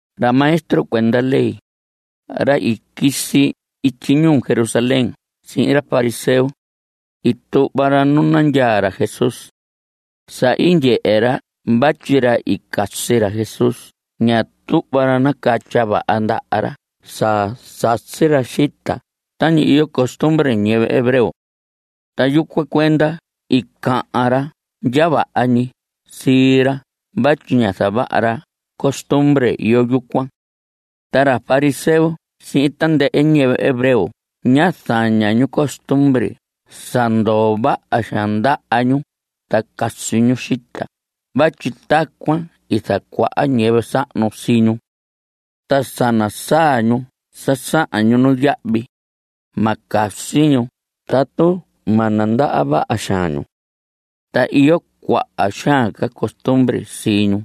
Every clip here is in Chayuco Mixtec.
Ra maestro cuenda ley, ra i quisi ityi ñuu Jerusalén sihin ra fariseo, i tuhva ra nu nandyaa ra Jesús. Sa i ndyehe ra vatyi ra i casi ra Jesús ña tuhva ra nacatya vaha ndaha ra sa sasi ra xita tañi iyo costumbre ñiyɨvɨ hebreo. Ta yucuan cuenda i cahan ra ndya vaha ñi sii ra vatyi ñá zavaha ra costumbre iyo yucuan. Ta ra fariseo sihin tandɨhɨ ñiyɨvɨ hebreo ña zaña ñu costumbre sa ndoo vaha xaan ndaha ñu ta casi ñu xita vatyi tacuan i zacuaha ñiyɨvɨ sahnu sii ñu. Ta sa nasaa ñu sa sahan ñu nuyahvi, ma casi ñu tatu ma nandaha vaha xaan ñu. Ta iyo cuaha xaan ca costumbre sii ñu.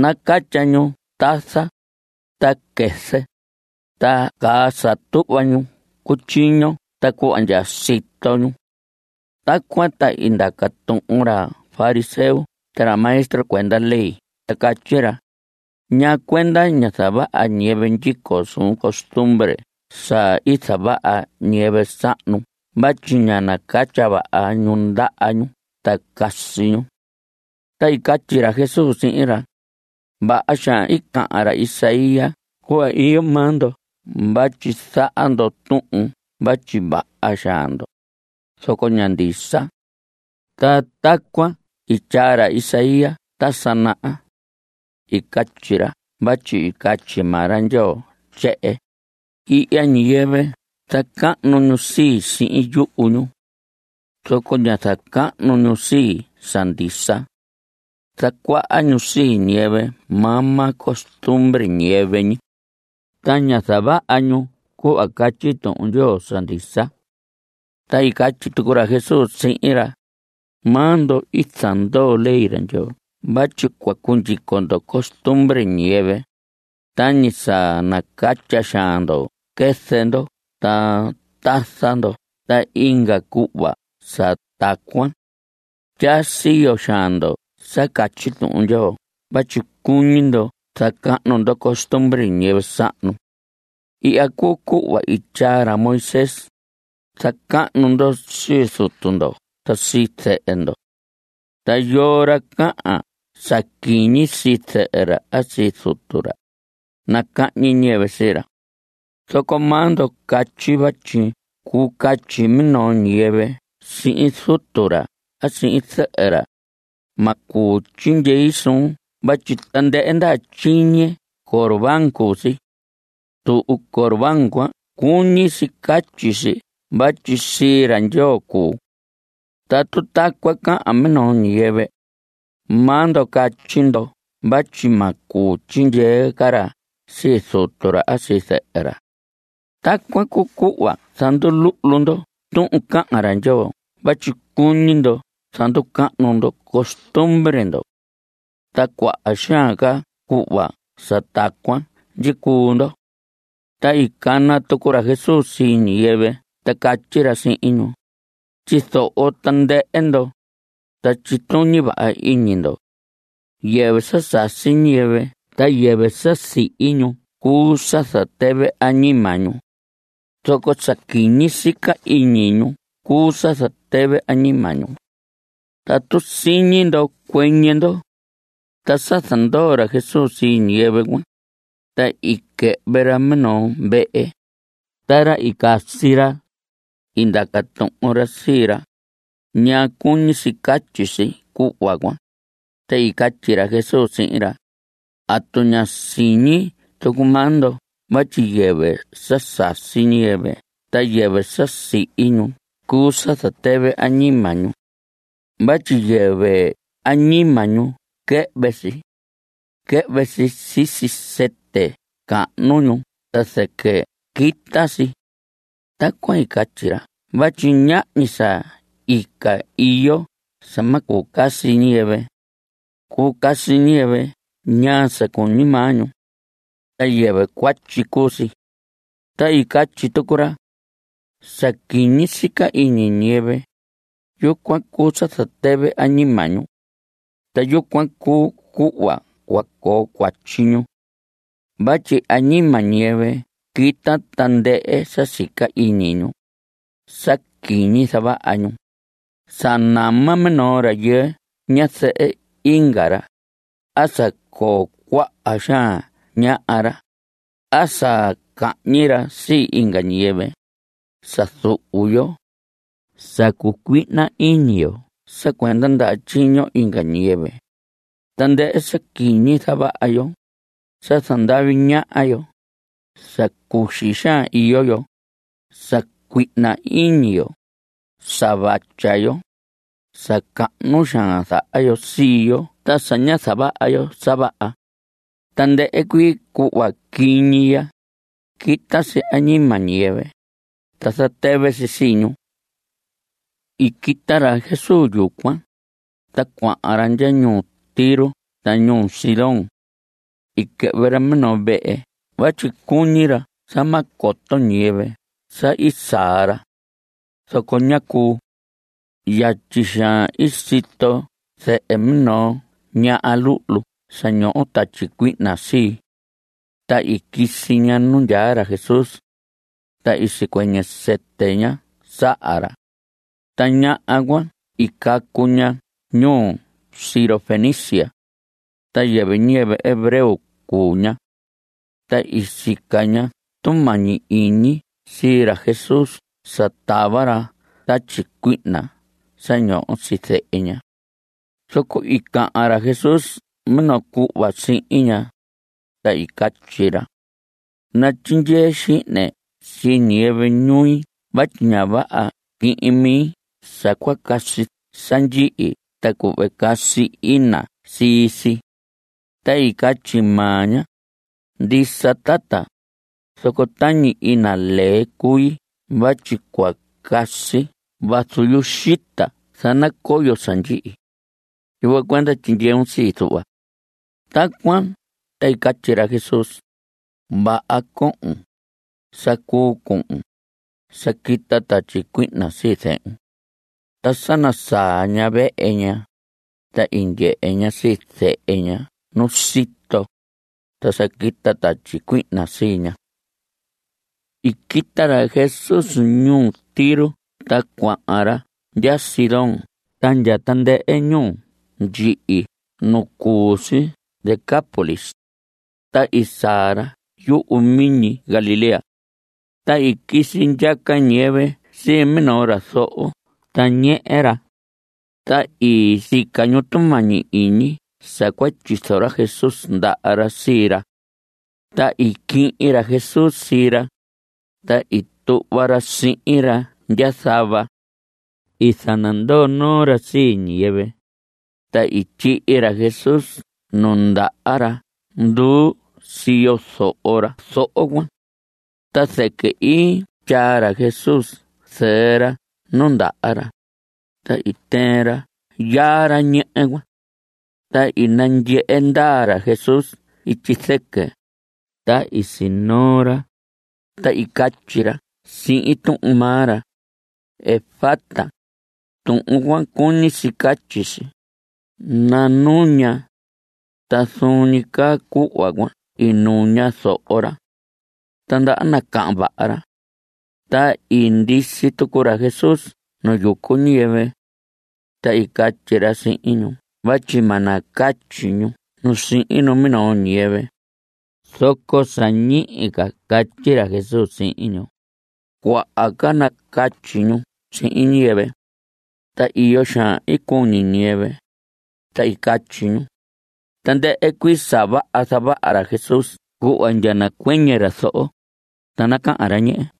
Nacatya ñu tasa, ta quɨzɨ, ta caa sa tuhva ñu cutyiño ta cuhva ndya sito ñu. Tacuan ta i ndaca tuhun ra fariseo ta ra maestro cuenda ley ta catyi ra: ¿Ñaa cuenda ña zavaha ñiyɨvɨ ndyico suun costumbre sa i zavaha ñiyɨvɨ sahnu vatyi ña nacatya vaha ñu ndaha ñu ta casi ñu? Ta i catyi ra Jesús sihin ra: Vaha xaan i cahan ra Isaías cuhva iyo maa ndo vatyi zaha ndo tuhun vatyi vaha xaan ndo, zoco ña ndisa. Ta tacuan i tyaa ra Isaías ta sa naha. I catyi ra vatyi i catyi maa ra Ndyoo tyehen: Ihya ñiyɨvɨ zacahnu ñu sii, sihin yuhu ñu. Zoco ña zacahnu ñu sii, sa ndisa. Zacuaha ñu sii ñiyɨvɨ maa maa costumbre ñiyɨvɨ ñi. Ta ña zavaha ñu cuhva catyi Tuhun Ndyoo sa ndisa. Ta i catyi tucu ra Jesús sihin ra: Maa ndo i zandoo ley ra Ndyoo vatyi cua cundyico ndo costumbre ñiyɨvɨ, tañi sa nacatya xaan ndo quɨzɨ ndo ta tasa ndo ta inga cuhva sa tacuan. Tyaa siyo xaan ndo sa catyi Tuhun Ndyoo vatyi cuñi ndo zacahnu ndo costumbre ñiyɨvɨ sahnu. Ihya cuu cuhva i tyaa ra Moisés: “Zacahnu ndo sii zutu ndo ta sii zɨhɨ ndo.” Ta “Yoo ra cahan sa quiñi sii zɨhɨ ra a sii zutu ra, nacahñi ñiyɨvɨ sii ra.” Zoco maa ndo catyi vatyi cuu catyi minoo ñiyɨvɨ sihin zutu ra a sihin zɨhɨ ra: “Ma cuu tyindyei suun vatyi tandɨhɨ ndaha tyiñe corbán cuu si.” (Tuhun corbán cuan cuñi si catyi si vatyi sii ra Ndyoo cuu.) Tatu tacuan cahan minoo ñiyɨvɨ, maa ndo catyi ndo vatyi ma cuu tyindyee ca ra sii zutu ra a sii zɨhɨ ra. Tacuan cuu cuhva zanduluhlu ndo tuhun cahan ra Ndyoo vatyi cuñi ndo zanducahnu ndo costumbre ndo. Ta cuaha xaan ca cuhva sa tacuan ndyicuu ndo. Ta i cana tucu ra Jesús sii ñiyɨvɨ ta catyi ra sihin ñu: Tyizoho tandɨhɨ ndo, ta tyituñi vaha iñi ndo. Yɨvɨ sa sasi ñiyɨvɨ ta yɨvɨ sa sihi ñu cuu sa zatɨvɨ añima ñu. Zoco sa quiñi sica iñi ñu cuu sa zatɨvɨ añima ñu. Tatu siñi ndo, cuɨñɨ ndo. Ta sa zandoo ra Jesús sii ñiyɨvɨ cuan, ta i quɨhvɨ ra minoo vehe. Ta ra i casi ra, i ndaca tuhun ra sii ra: ¿Ñaa cuñi si catyi si cuhva cuan? Ta i catyi ra Jesús sihin ra: ¿Atu ña siñi tucu maa ndo vatyi yɨvɨ sa sasi ñiyɨvɨ ta yɨvɨ sa sihi ñu cuu sa zatɨvɨ añima ñu? Vatyi yɨvɨ añima ñu quɨhvɨ si. Quɨhvɨ si sisi sɨtɨ cahnu ñu ta zɨquɨ quita si. Tacuan i catyi ra vatyi ñahñi sa ica iyo sa ma cuu casi ñiyɨvɨ. Cuu casi ñiyɨvɨ ñaa sa cuñi maa ñu. Ta yɨvɨ cuatyi cuu si. Ta i catyi tucu ra: Sa quiñi sica iñi ñiyɨvɨ, yucuan cuu sa zatɨvɨ añima ñu. Ta yucuan cuu cuhva cua coo cuatyi ñu. Vatyi añima ñiyɨvɨ quita tandɨhɨ sa sica iñi ñu, sa quiñi zavaha ñu, sa nama minoo rayɨɨ ñazɨhɨ inga ra, a sa coo cuaha xaan ñaha ra, a sa cahñi ra sii inga ñiyɨvɨ, sa zuhu yo, sa cucuihna iñi yo sa cuenda ndaha tyiño inga ñiyɨvɨ, tandɨhɨ sa quiñi zavaha yo, sa zandavi ñaha yo, sa cuxi xaan iyo yo, sa cuihna iñi yo, sa vatya yo, sa cahnu xaan zaha yo sii yo ta sa ña zavaha yo sa vaha. Tandɨhɨ cuii cuhva quiñi ya, quita si añima ñiyɨvɨ, ta zatɨvɨ si sii ñu. I quita ra Jesús yucuan, ta cuahan ra ndya ñuu Tiro ta ñuu Sidón. I quɨhvɨ ra minoo vehe vatyi cuñi ra sa ma coto ñiyɨvɨ sa i saa ra. Zoco ñá cuu. Yatyi xaan i sito zɨhɨ minoo ñaha luhlu sa ñoho tatyi cuihna sii. Ta i quisi ña nu ndyaa ra Jesús. Ta i sicuɨñɨ sɨtɨ ña saha ra. Ta ñaha cuan i cacu ña ñuu Sirofenicia. Ta yɨvɨ ñiyɨvɨ hebreo cuu ña. Ta i sica ña tumañi iñi sii ra Jesús sa tava ra tatyi cuihna sa ñoho sii zehe ña. Zoco i cahan ra Jesús minoo cuhva sihin ña, ta i catyi ra: Natyindyee xihne sii ñiyɨvɨ ñui vatyi ña vaha quihin mi sa cua casi sa ndyihi ta cuhve casi ina sii si. Ta i catyi maa ña: Ndisa, tata, zoco tañi ina lee cui vatyi cua casi vazu yuxita zanacoyo sa ndyihi. Yucuan cuenda tyindyeun sii, zuhva. Tacuan ta i catyi ra Jesús: Vaha cohon. Sa cuu cuhun. Sa quita tatyi cuihna sii zehun. Ta sa nasaa ña vehe ña, ta i ndyehe ña sii zehe ña nu sito, ta sa quita tatyi cuihna sii ña. I quita ra Jesús ñuu Tiro ta cuahan ra ndya Sidón ta ndya tandɨhɨ ñuu ndyihi nu cu si Decápolis. Ta i saa ra yumiñi Galilea. Ta i quisi ndyaca ñiyɨvɨ sii minoo ra zoho ta ñehe ra. Ta i sica ñu tumañi iñi sa cua tyizo ra Jesús ndaha ra sii ra. Ta i quihin ra Jesús sii ra, ta i tuhva ra sihin ra ndya zava. I zanandoo noo ra sii ñiyɨvɨ. Ta i tyihi ra Jesús nu ndaha ra nduu siyo zoho ra zoho cuan. Ta zɨquɨ i tyaa ra Jesús zɨɨ ra nu ndaha ra, ta i tɨɨn ra yaa ra ñehe cuan. Ta i nandyehe ndaa ra Jesús ityi zɨquɨ, ta i sinoo ra, ta i catyi ra sihin tuhun maa ra: ¡Efata! Tuhun cuan, cuñi si catyi si: ¡Nanuña! Ta zuun ñi caa cuhva cuan i nuña zoho ra. Ta ndaha nacahan vaha ra. Ta i ndisi tucu ra Jesús nu yucu ñiyɨvɨ. Ta i catyi ra sihin ñu vatyi ma nacatyi ñu nu sihin minoo ñiyɨvɨ. Zoco sa ñihi ca catyi ra Jesús sihin ñu, cuaha ca nacatyi ñu sihin ñiyɨvɨ. Ta iyo xaan i cuñi ñiyɨvɨ, ta i catyi ñu: Tandɨhɨ cuii sa vaha zavaha ra Jesús cuhva ndya nacuɨñɨ ra zoho, ta nacahan ra ñehe.